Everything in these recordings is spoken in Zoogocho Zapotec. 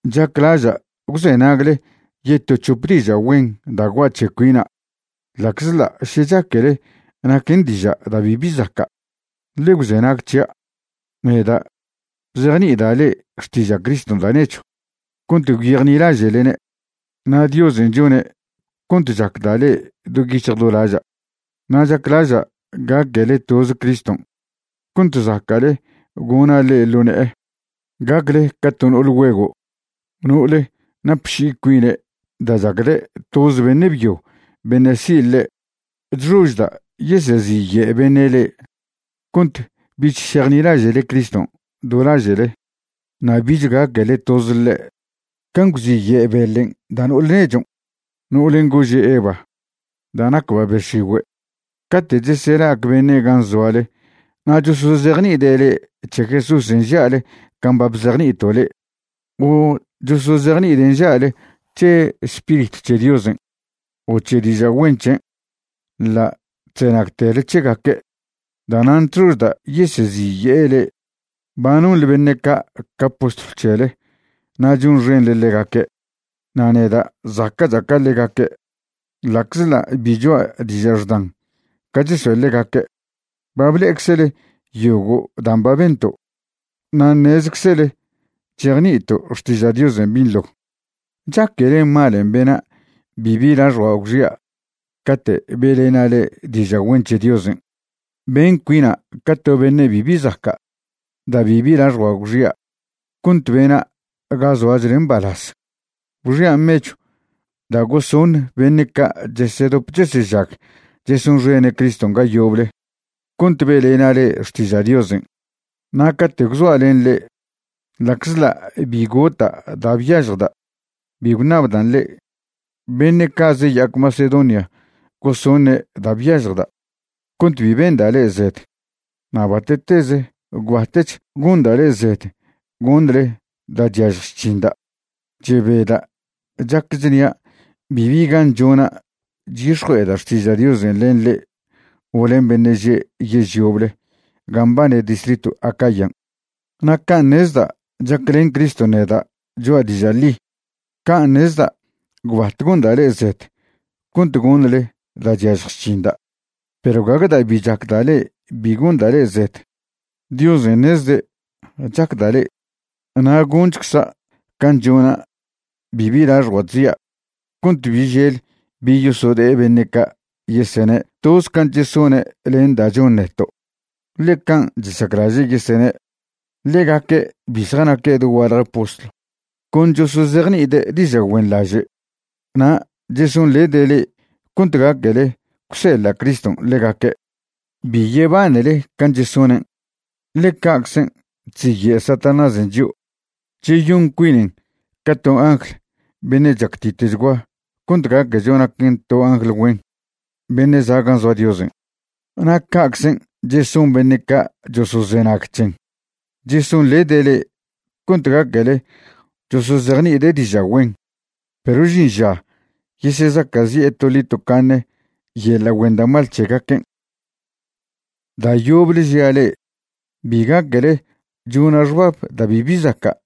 Chaclaža' gwzenagle yeto c̱hop diža' güen da' gua' c̱he cuina' ḻa'czḻa' še chaquele naquen diža' da' bibi zaca'. Ḻe gwzenag c̱hia'. Neda' bzejni'ida' le'e xtiža' Criston' da' nechw cont gwyejnilaže'lene', na' Diosen' chone' cont chacda' le'e do yic̱hj do laža'. Na' chaclaža' gaquele toze Criston' cont zaca'le gona' le'e ḻo ne'e, gacle ca to no'ol güego', no'ole napši'i cuine' da' chacde' toz beṉe' byo beṉe' si' ḻe'. Chxožda' yeseziye' beṉe' le'e cont bich šejnilaže'le Criston' do laže'le na' bich gaquele toz ḻe'. Can' gwziye' beḻen' da' no'ole nechon', no'olen' gože' Eva, da' nacba' be x̱igüe'. Cate' chesela'ac beṉe' gan' zoale na' chosozejni'ide' le'e c̱he Jesúsen' nža'le can' ba bzejni'ito' le'e, o chosozejni'ide' nža'le c̱he Spiritw c̱he Diosen' o c̱he diža' güen c̱hen', ḻa' chzenagtele c̱hegaque'. Da'nan' chxožda' yeseziye'e le'e. Ba nonḻe beṉe' ca' ca postlw c̱hele na' chonxenḻe ḻegaque'. Na' neda' zaca'cha' ca ḻegaque'. Ḻa'czḻa' bi choa' diža' xdan ca chesoe' ḻegaque', ba ble'eczele yogo' dan' ba bento' na' ṉezczele chejni'ito' xtiža' Diosen' binḻo. ¿Chaquele malen' bena' bibi laxjua' gwxia' cate' be'lena' le'e diža' güen c̱he Diosen'? Ben cuina' ca to beṉe' bibi zaca' da' bibi laxjua' gwxia' cont bena' ga zoachle mbalaz. Gwxia' mechw da' gosoṉ beṉe' ca' chesedop chesežag chesonxene' Criston' ga yoble cont be'lena' le'e xtiža' Diosen'. Na' cate' gwzoa' len le'e, ḻa'czḻa' bi gota' da' byažjda', bi gwṉabdan' le'e. Beṉe' ca' zeya'ac Macedonia gosoṉe' da' byažjda' cont bi benda' le'e zed, na' bate'teze gwbatech gonda' le'e zed goṉle da' chyažj chc̱hinda'. Chebeda' chac chnia' bibi gan chona' chyix̱jue'eda' xtiža' Diosen' len le'e o len beṉe' že' yež yoble ga mbane distritw Acayan'. Na' can' ṉezda' chaclen Criston' neda' choa' diža' ḻi, can' ṉezda' gwbat gonda' le'e zed cont goṉle da' chyažj chc̱hinda'. Perw gague da' bi chacda' le'e bi gonda' le'e zed. Diosen' ṉezde' chacda' le'e. Na' gonchcza' can' chona' bibi laxjua' chzia' cont bi žel bi yosode'e beṉe' ca' yesene' toz can' chesone' len da' chon neto', ḻe can' chesaclaže' yesene'. Ḻegaque' bi zjanaque' dogualje postlw. Con chosozejni'ide' diža' güenḻaže' na' chesonḻede' le'e cont gaquele gwseḻa' Criston' ḻegaque'. Bi yebanele can' chesonen', ḻe ca'czen' chziye' Satanásen' chio', cheyon cuinen ca to angl beṉe' chactitchgua cont gaquecho naquen to angl güen beṉe' za' gan' zoa Diosen'. Na' ca'czen' cheson beṉe' ca' chosozenag c̱hen, chesonḻede' le'e cont gaquele chosozejni'ide' diža' güen. Perw žin ža yesezaca'zi'e toḻi tocaṉe yeḻa' güen da' mal c̱hegaquen'. Da' yoble žia' le'e, bi gaquele chona' xbab da' bibi zaca'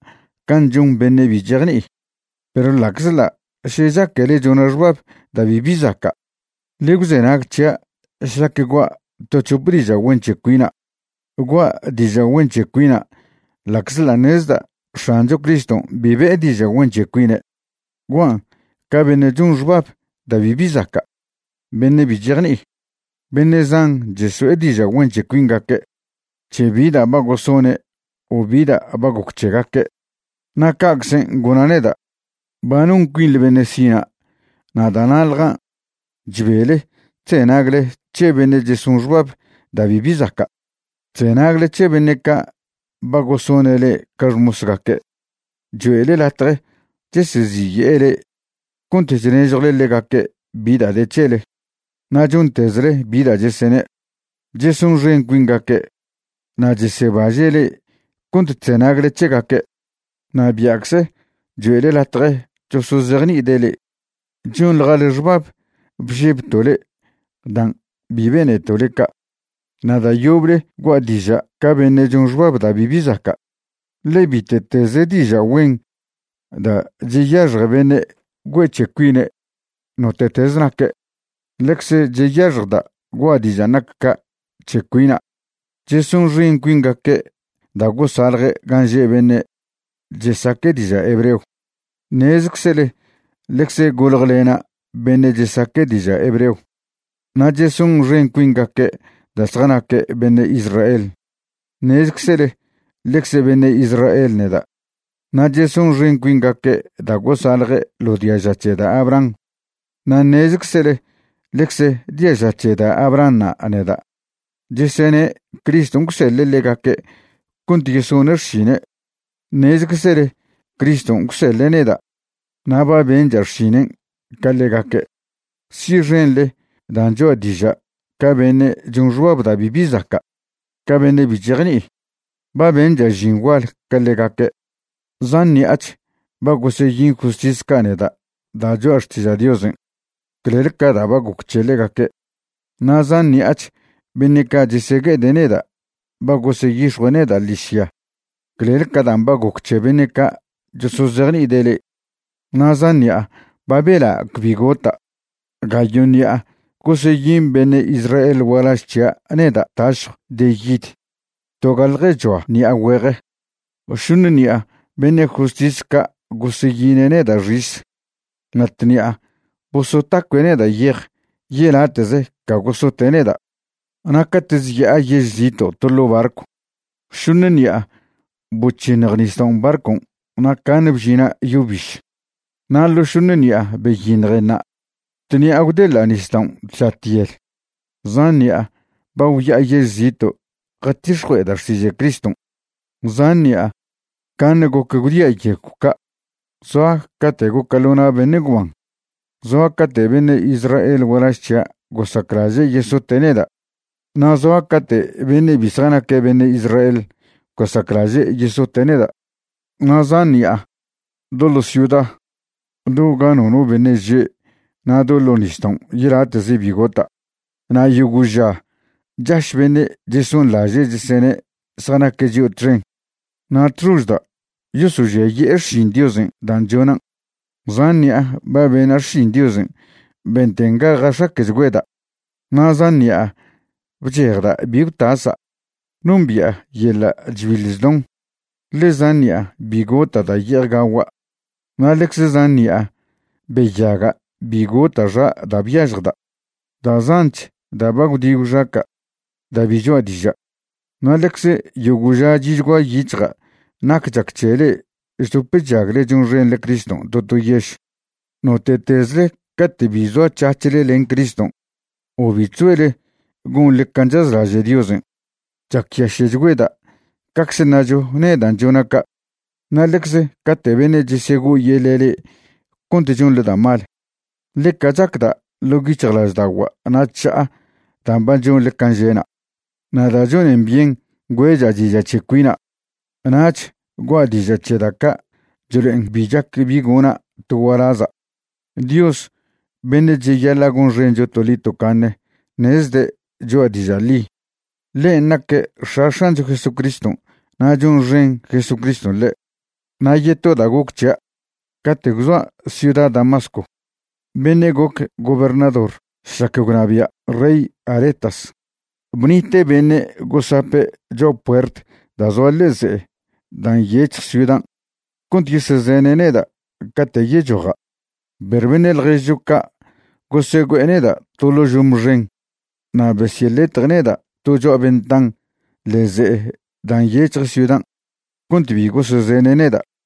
can' chon beṉe' bi chejni'i. Perw ḻa'czḻa' še chaquele chona' xbab da' bibi zaca', ḻe gwzenag c̱hia' šlac gua' to c̱hope diža' güen c̱he cuina'. Gua' diža' güen c̱he cuina' ḻa'czḻa' ṉezda' X̱ancho Criston' bi be'e diža' güen c̱he cuine'. Guan' ca beṉe' chon xbab da' bibi zaca', beṉe' bi chejni'i. Beṉe' zan cheso'e diža' güen c̱he cuingaque' c̱he bi da' ba gosone' o bi da' ba goc c̱hegaque', na' ca'czen' gona' neda'. Ba non cuinḻe beṉe' sina' na' da'na'ḻjan' chbele chzenagle c̱he beṉe' cheson xbab da' bibi zaca'. Chzenagle c̱he beṉe' ca' ba gosone' le'e ca xmosgaque'. Choe'le latje cheseziye'e le'e cont chnežjwle ḻegaque' bi da' de c̱hele na' chontezle bi da' chesene'. Chesonxen cuingaque' na' chesebaže' le'e cont chzenagle c̱hegaque', na' bia'cze choe'le latje chosozejni'ide' le'e. Chonḻjale xbab bžebto' le'e dan' bi beneto' le'e ca'. Na' da' yoble gua' diža' ca beṉe' chon xbab da' bibi zaca', ḻe bite'teze diža' güen da' cheyaxje beṉe' güe'e c̱he cuine' note'teze naque', ḻecze cheyaxjda' gua' dižan' nac ca' c̱he cuina'. Chesonxen cuingaque' da' gosalje' gan' že' beṉe' chesaque' diža' hebreo. Ṉezczele ḻecze goljelena' beṉe' chesaque' diža' hebreo. Na' chesonxen cuingaque' da' zjanaque' beṉe' Israel. Ṉezczele ḻecze beṉe' Israel neda'. Na' chesonxen cuingaque' da' gosalje' ḻo diaža c̱he da' Abraham. Na' ṉezeczele ḻecze diaža c̱he da' Abrahanṉa' neda'. Chesene' Criston' gwseḻe' ḻegaque' cont yesone' xšine'. Ṉezczele Criston' gwseḻe' neda' na' ba bencha' xšinen' ca ḻegaque'. Si'xenḻe dan' choa' diža' ca beṉe' chon xbab da' bibi zaca', ca beṉe' bi chejni'i. Ba bencha' žin gual ca ḻegaque', zan ṉi'ach ba goseyin justis ca' neda' da' choa' xtiža' Diosen' clel ca da' ba goc c̱he ḻegaque'. Na' zan ṉi'ach beṉe' ca' chesegue'ede' neda' ba goseyix̱jue' neda' ḻižya clel ca dan' ba goc c̱he beṉe' ca' chosozejni'ide' le'e. Na' zan ṉi'a ba bela' cbi gota'. Gayo' ṉi'a goseyin beṉe' Israel gualaž c̱hia' neda' tašjw de yid togaljechoa ṉi'a güeje. Šoṉe ṉi'a beṉe' justis ca' goseyine' neda' xis. Na' tṉi'a bosotacue' neda' yej yelate'ze ca gosote' neda'. Na' cate' zya'a yež zito' to ḻo' barcw, šoṉ ṉi'a boc̱hiṉj nisdaon' barcon', na' caṉe bžina' yo biž. Na' ḻo šoṉ ṉi'an beyiṉjenṉa', tṉi'a gwdeḻa' nisdaon' tža tyel. Zan ṉi'a ba gwya'a yež zito' jatix̱jue'eda' xtiža' Criston'. Zan ṉi'a caṉe goc gwdia' yegw ca'. Zoa cate' goca' ḻo na' beṉe' gwban. Zoa cate' beṉe' Israel gualaž c̱hia' gosaclaže' yesote' neda', na' zoa cate' beṉe' bi zjanaque' beṉe' Israel gosaclaže' yesote' neda'. Na' zan ṉi'a do ḻo ciuda, do ga nono beṉe' že' na' do ḻo nisdaon' yelate'ze bi gota'. Na' yogo' ža chaš beṉe' chesonlaže' chesene' zjanaque' chio' txen na' chxožda' yosožiaye'e xšin Diosen' dan' chonan'. Zan ṉi'a ba bena' xšin Diosen' benten ga jax̱aque'chgüeda', na' zan ṉi'a bchejda' bi gwtasa'. Nombi'a yeḻa' chbiḻ chdon, ḻe zan ṉi'a bi gota' da' ye'ej gagua'. Na' ḻecze zan ṉi'a beyaga' bi gota' xa' da' byažjda'. Da' zanch da' ba gwdi gwxaca' da' bi choa' diža', na' ḻecze yogo' ža chi'chgua yic̱hja' nac chac c̱he le'e chdop chžagle chonxenḻe Criston' to to yež. Note'tezle cate' bi zoac̱hac̱hle len Criston' o bi chzoele gonḻe can' chazlaže' Diosen', chacyaše'chgüeda' cacze ṉacho nedan' chona' ca'. Na' ḻecze cate' beṉe' chesego'oyeḻe' le'e cont chonḻe da' mal, ḻeca chacda' ḻo' yic̱hjlažda'ogua' na' chža'a dan' ba chonḻe can' že'na'. Na' da' chonen byen güe'cha' diža' c̱he cuina', nach gua' diža' c̱he da' ca' chlo'en bi chac bi gona' to gualaza'. Dios beṉe' cheyaḻa' gonxencho toḻi tocaṉe ṉezde' choa' diža' ḻi. Ḻen' naque' X̱a X̱ancho Jesucriston' na' chonxen Jesucriston' ḻe'. Na' yeto da' goc c̱hia', cate' gwzoa' ciuda Damasco, beṉe' goc gobernador šlac gwnabia' rey Aretas bnite' beṉe' gosape' cho'a puert da' zoa ḻe'e ze'e da' nyec̱hj ciudan' cont yesezene' neda' cate' yechoja'. Perw beṉe' ḻježcho ca' gosegüe'e neda' to ḻo' žome xen na' besyeḻetje' neda' to cho'a ventan ḻe'e ze'e da' nyec̱hje ciudan' cont bi gosezene' neda'.